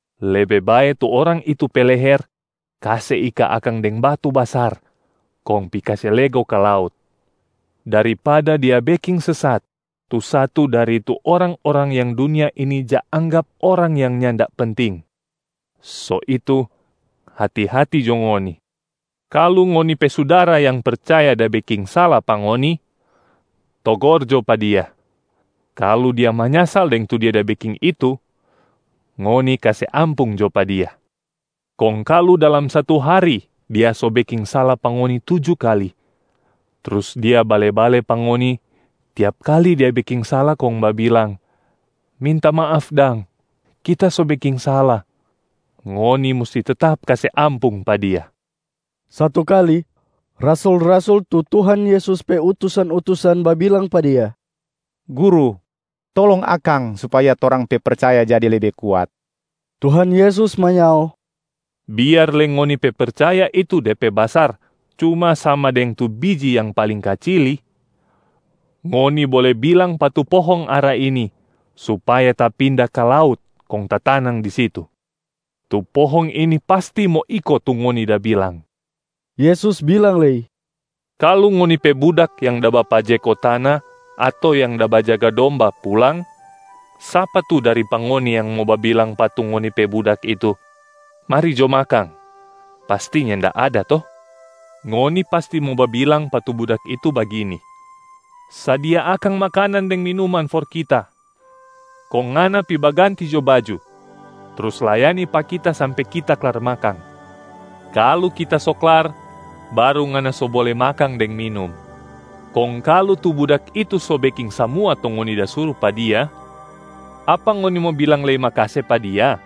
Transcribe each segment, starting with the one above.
Lebe bae tu orang itu pe leher kase ika akang deng batu basar kong pi kase lego ka laut, daripada dia beking sesat tu satu dari tu orang-orang yang dunia ini ja anggap orang yang nyanda penting. So itu hati-hati jo ngoni. Kalu ngoni pe sudara yang percaya da beking sala pa ngoni, togor jo pa dia. Kalu dia manyasal deng tu dia da beking itu, ngoni kase ampung jo pa dia. Kong kalu dalam satu hari dia so beking sala pa ngoni tuju kali, trus dia bale-bale pa ngoni tiap kali dia beking sala kong babilang, ‘Minta maaf dang, kita so beking sala’, ngoni musti tetap kase ampung pa dia.” Satu kali, rasul-rasul tu Tuhan Yesus pe utusan-utusan babilang pa Dia, “Guru, tolong akang supaya torang pe percaya jadi lebe kuat.” Tuhan Yesus manyao, “Biar lei ngoni pe percaya itu de pe basar cuma sama deng tu biji yang paling kacili, ngoni bole bilang pa tu pohong ara ini supaya tapinda ka laut kong tatanang di situ. Tu pohong ini pasti mo iko tu ngoni da bilang.” Yesus bilang lei, “Kalu ngoni pe budak yang da bapajeko tana ato yang da bajaga domba pulang, sapa tu dari pa ngoni yang mo babilang pa tu ngoni pe budak itu, ‘Mari jo makang!’ Pasti nyanda ada to? Ngoni pasti mo babilang pa tu budak itu bagini, ‘Sadia akang makanan deng minuman for kita. Kong ngana pi baganti jo baju, trus layani pa kita sampe kita klar makang. Kalu kita so klar, baru ngana so bole makang deng minum.’ Kong kalu tu budak itu so beking samua tu ngoni da suru pa dia, apa ngoni mo bilang lei makase pa dia?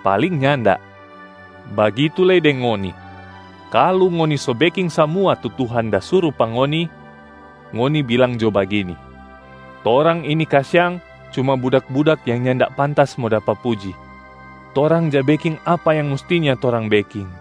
Paling nyanda. Bagitu lei deng ngoni. Kalu ngoni so beking samua tu Tuhan da suru pa ngoni, ngoni bilang jo bagini, ‘Torang ini kasiang cuma budak-budak yang nyanda pantas mo dapa puji. Torang ja beking apa yang mustinya torang beking.’”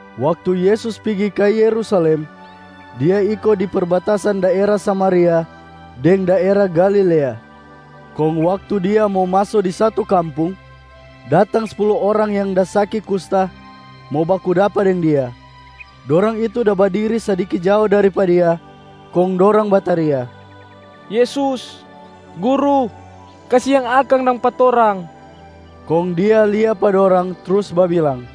Waktu Yesus pigi ka Yerusalem, Dia iko di perbatasan daera Samaria deng daera Galilea. Kong waktu Dia mo maso di satu kampung, datang spulu orang yang da saki kusta mo baku dapa deng Dia. Dorang itu da badiri sadiki jao dari pa Dia. Kong dorang bataria, “Yesus! Guru! Kasiang akang dang pa torang!” Kong Dia lia pa dorang trus babilang,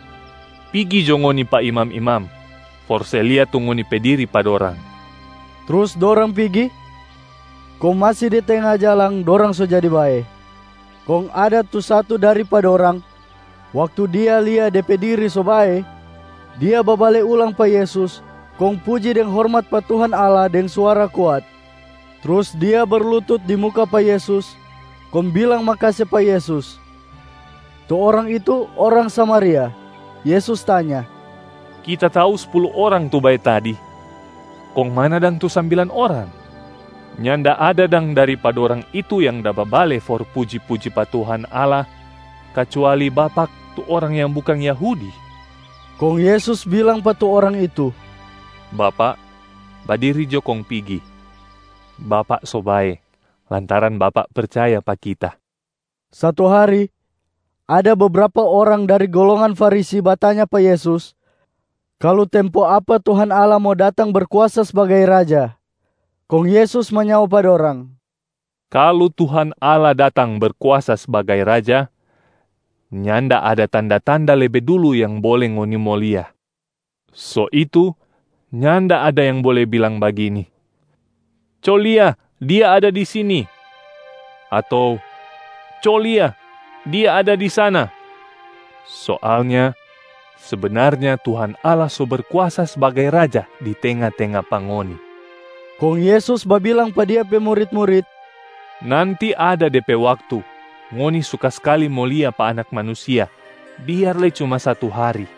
“Pigi jo ngoni pa imam-imam for se lia tu ngoni pe diri pa dorang.” Trus dorang pigi, kong masi di tenga jalang dorang so jadi bae. Kong ada tu satu dari pa dorang, waktu dia lia de pe diri so bae, dia babale ulang pa Yesus kong puji deng hormat pa Tuhan Allah deng suara kuat. Trus dia berlutut di muka pa Yesus kong bilang makase pa Yesus. Tu orang itu orang Samaria. Yesus tanya, “Kita tau spulu orang tu bae tadi, kong mana dang tu sambilan orang? Nyanda ada dang dari pa dorang itu yang da babale for puji-puji pa Tuhan Allah, kacuali bapak tu orang yang bukang Yahudi?” Kong Yesus bilang pa tu orang itu, “Bapak, badiri jo kong pigi. Bapak so bae lantaran bapak percaya pa Kita.” Satu hari ada bebrapa orang dari golongan Farisi batanya pa Yesus kalu tempo apa Tuhan Allah mo datang Berkuasa sbagai Raja. Kong Yesus manyao pa dorang, “Kalu Tuhan Allah datang Berkuasa sbagai Raja, nyanda ada tanda-tanda lebe dulu yang bole ngoni mo lia. So itu nyanda ada yang bole bilang bagini, ‘Co lia dia ada di sini’ ato ‘Co lia, dia ada di sana!’ Soalnya sebenarnya Tuhan Allah so Berkuasa sbagai Raja di tenga-tenga pa ngoni.” Kong Yesus babilang pa Dia pe murit-murit, “Nanti ada de pe waktu ngoni suka skali mo lia pa Anak Manusia biar lei cuma satu hari,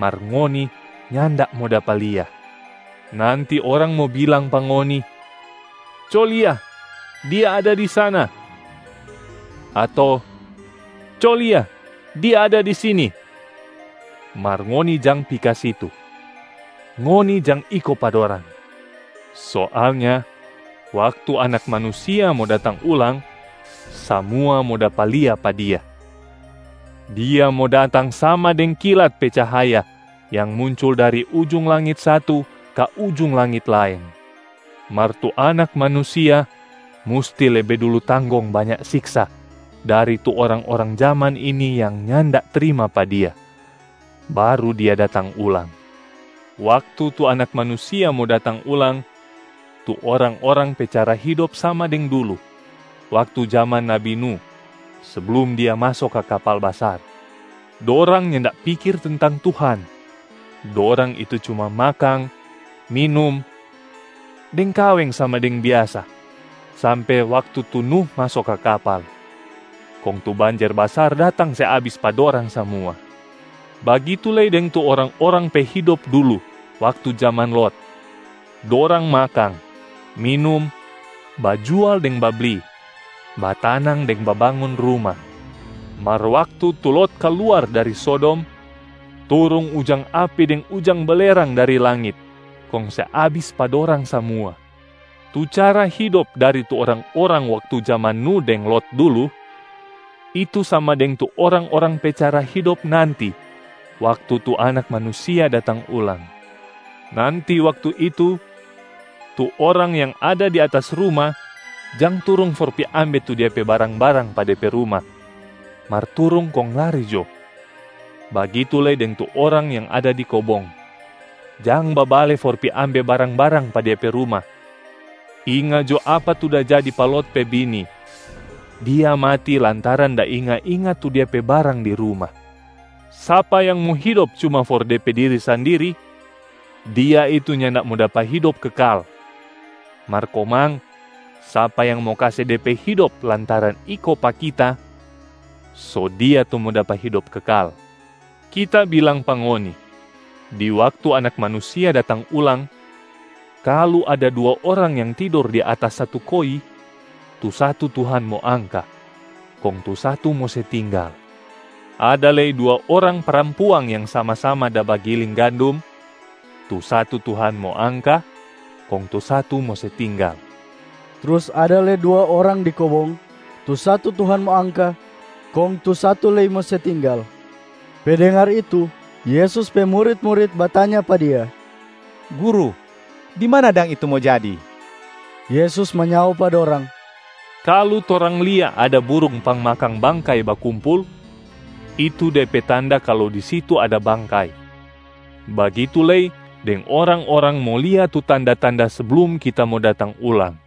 mar ngoni nyanda mo dapa lia. Nanti orang mo bilang pa ngoni, ‘Co lia, Dia ada di sana!’ ato, ‘Co lia, Dia ada di sini!’ Mar ngoni jang pi ka situ, ngoni jang iko pa dorang. Soalnya waktu Anak Manusia mo datang ulang, samua mo dapa lia pa Dia. Dia mo datang sama deng kilat pe cahaya yang muncul dari ujung langit satu ka ujung langit laeng. Mar tu Anak Manusia musti lebe dulu tanggong banya siksa dari tu orang-orang jaman ini yang nyanda trima pa Dia, baru Dia datang ulang. Waktu tu Anak Manusia mo datang ulang, tu orang-orang pe cara hidop sama deng dulu waktu jaman nabi Nuh seblum dia maso ka kapal basar. Dorang nyanda pikir tentang Tuhan, dorang itu cuma makang, minum, deng kaweng sama deng biasa sampe waktu tu Nuh maso ka kapal. Kong tu banjer basar datang se abis pa dorang samua. Bagitu lei deng tu orang-orang pe hidop dulu waktu jaman Lot. Dorang makang, minum, bajual deng babli, batanang deng babangun ruma. Mar waktu tu Lot kaluar dari Sodom, turung ujang api deng ujang belerang dari langit kong se abis pa dorang samua. Tu cara hidop dari tu orang-orang waktu jaman Nuh deng Lot dulu, itu sama deng tu orang-orang pe cara hidop nanti waktu tu Anak Manusia datang ulang. Nanti waktu itu, tu orang yang ada di atas ruma jang turung for pi ambe tu dia pe barang-barang pa de pe ruma, mar turung kong lari jo. Bagitu lei deng tu orang yang ada di kobong, jang babale for pi ambe barang-barang pa dia pe ruma. Inga jo apa tu da jadi pa Lot pe bini, dia mati lantaran da inga-inga tu dia pe barang di ruma! Sapa yang mo hidop cuma for de pe diri sandiri, dia itu nyanda mo dapa hidop kekal. Mar komang sapa yang mo kase de pe hidop lantaran iko pa Kita, so dia tu mo dapa hidop kekal. Kita bilang pa ngoni, di waktu Anak Manusia datang ulang, kalu ada dua orang yang tidor di atas satu koi, tu satu Tuhan mo angka, kong tu satu mo se tinggal. Ada lei dua orang parampuang yang sama-sama da bagiling gandum, tu satu Tuhan mo angka, kong tu satu mo se tinggal.” [ Trus ada lei dua orang di kobong, tu satu Tuhan mo angka, kong tu satu lei mo se tinggal.] Pe dengar itu, Yesus pe murit-murit batanya pa Dia, “Guru, di mana dang itu mo jadi?” Yesus manyao pa dorang, “Kalu torang lia ada burung pangmakang bangkai bakumpul, itu de pe tanda kalu di situ ada bangkai, bagitu lei deng orang-orang mo lia tu tanda-tanda seblum Kita mo datang ulang.”